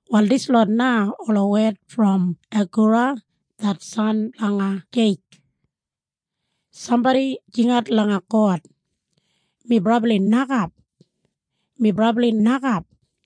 Wal dislot na ola wed brom Agura det san blanga Jeike. Sambodi jingat langa God, “Mi brabli nokap. Mi brabli nokap.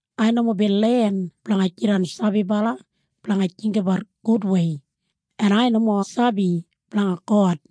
Ai nomo bin len blanga jidan sabibala blanga jinggabat gudwei, en ai nomo sabi blanga God.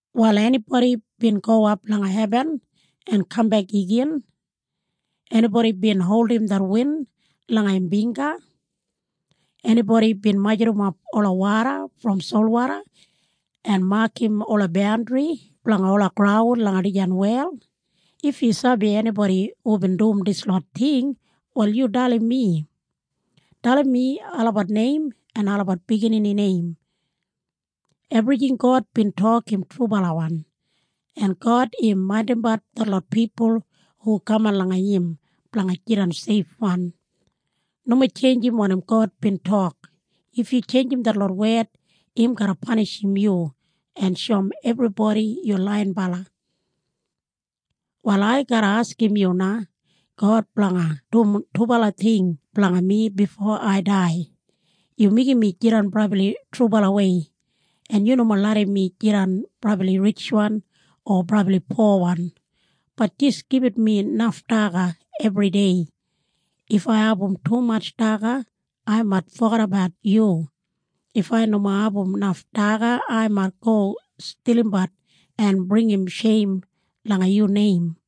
“Wal enibodi bin gowap langa hebin en kambek igin? Enibodi bin holdim det win langa im bingga? Enibodi bin majurrumap ola woda brom solwoda en makam ola bandri blanga ola graun langa dijan wel? If yu sabi enibodi hubin dum dislot ting wal yu dalim mi. Dalim mi olabat neim en olabat biginini neim. “Ebrijing God bin tok im trubalawan. En God im maindimbat detlot pipul hu kaman langa im blanga jidan seifwan. Nomo tjeinjim wanim God bin tok. If yu tjeinjim detlot wed im garra panishim yu en shoum ebribodi yu laiyinbala. “Wal ai garra askim yu na God blanga dum dubala ting blanga mi bifo ai dai. Yu meigim mi jidan brabli trubalawei, en yu nomo larram mi jidan brabli ritjwan o brabli powan, bat jis gibit mi naf daga ebridei. If ai abum tumatj daga ai mait fogedabat yu. If ai nomo abum naf daga ai mait go stilimbat en bringim sheim langa yu neim.”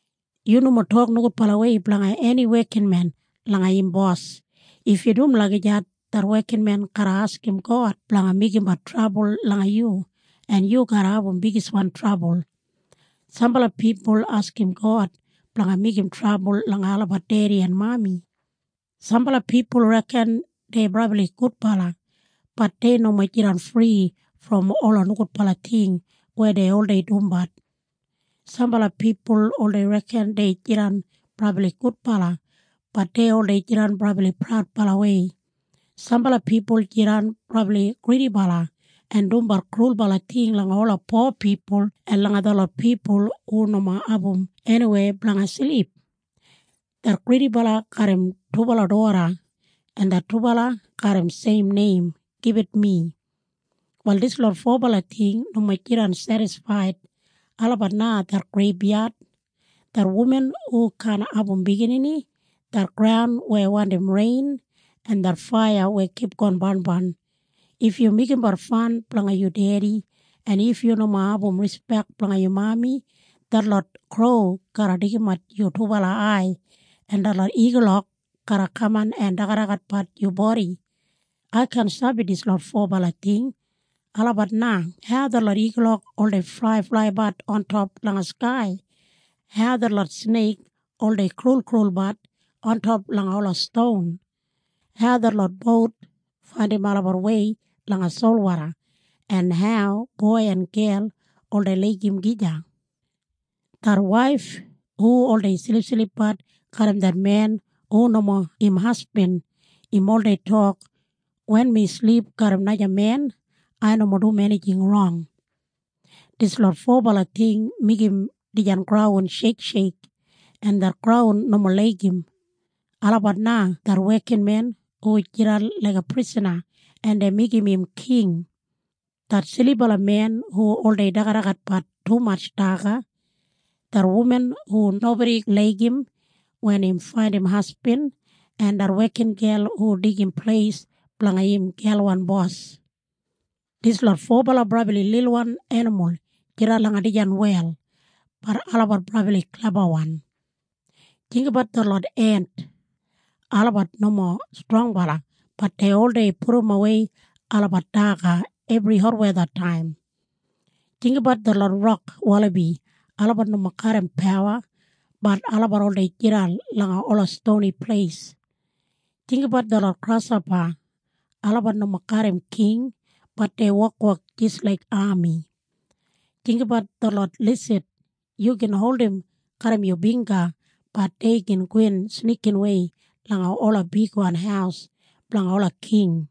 Yu nomo tok nogudbalawei blanga eni wekinmen langa im bos. If yu dum lagijat det wekinmen garra askim God blanga meigimbat trabul langa yu en yu garra abum bigiswan trabul. Sambala pipul askim God blanga meigim trabul langa olabat dedi en mami. Sambala pipul reken dei brabli gudbala, bat dei nomo jidan fri brom ola nogudbala ting weya dei oldei dumbat. Sambala pipul oldei reken dei jidan brabli gudbala, bat dei oldei jidan brabli praudbalawei. Sambala pipul jidan brabli gridibala en dumbat krulbala ting langa ola po pipul en langa detlot pipul hu nomo abum eniweya blanga silip. Det gridibala garram dubala doda en det dubala garram seim neim, “Gibit Mi”. Wal dislot fobala ting nomo jidan sedisfaid. Olabat na det greibyad, det wuman hu kaan abum biginini, det graun weya wandim rein, en det faiya weya kipgon barnbarn. If yu meigimbat fan blanga yu dedi, en if yu nomo abum rispek blanga yu mami, detlot kro garra deigimat yu dubala ai en detlot igulok garra kaman en dagadagatbat yu bodi. Ai kaan sabi dislot fobala ting. Olabat na hau detlot igulok oldei flaiflaibat ontop langa skai, hau detlot sneik oldei kraulkraulbat ontop langa ola ston, hau detlot bout faindim olabat wei langa solwoda, en hau boi en gel oldei laigim gija. Det waif hu oldei silipsilipbat garram det men hu nomo im hasbin, im oldei tok, “Wen mi silip garram naja men, ai nomo dum enijing rong.” Dislot fobala ting meigim dijan graun sheiksheik en det graun nomo laigim. Olabat na det wekinmen hu jidan laiga prisana en dei meigim im king, det silibala men hu oldei dagadagatbat tumatj daga, det wuman hu nobodi laigim wen im faindim hasbin, en det wekingel hu deigim pleis blanga im gelwan bos. Dislot fobala brabli lilwan enimul jidan langa dijan wel, bat olabat brabli klebawan. Jinggabat detlot ent. Olabat nomo strongbala bat dei oldei pudumwei olabat daga ebri hotwethataim. Jinggabat detlot rok walabi. Olabat nomo garram pawa, bat olabat oldei jidan langa ola stoni pleis. Jinggabat detlot grashopa. Olabat nomo garram king, bat dei wokwok jis laik ami. Jinggabat detlot lisid. Yu gin holdim garram yu bingga, bat dei gin gowin snikinwei langa ola bigwan haus blanga ola king.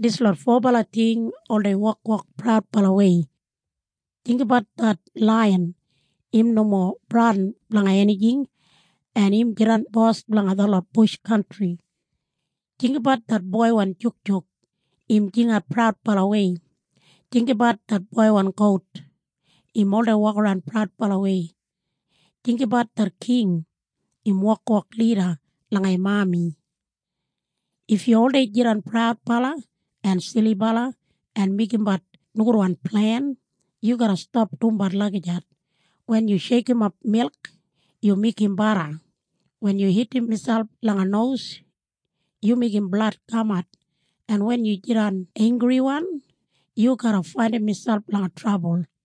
Dislot fobala ting oldei wokwok praudbalawei. Jinggabat det laiyan. Im nomo bradin blanga enijing, en im jidan bos blanga detlot bush kantri. Jinggabat det boiwan jukjuk. Im jingat praudbalawei. Jinggabat det boiwan gout. Im oldei wokaran praudbalawei. Jinggabat det king. Im wokwok lida langa im ami. If yu oldei jidan praudbala en silibala en meigimbat nogudwan plen, yu garra stap dumbat lagijat. Wen yu sheikimap milk, yu meigim bada. Wen yu hitim miselp langa nos, yu meigim blad kamat. En wen yu jidan einggriwan yu garra faindim miselp langa trabul.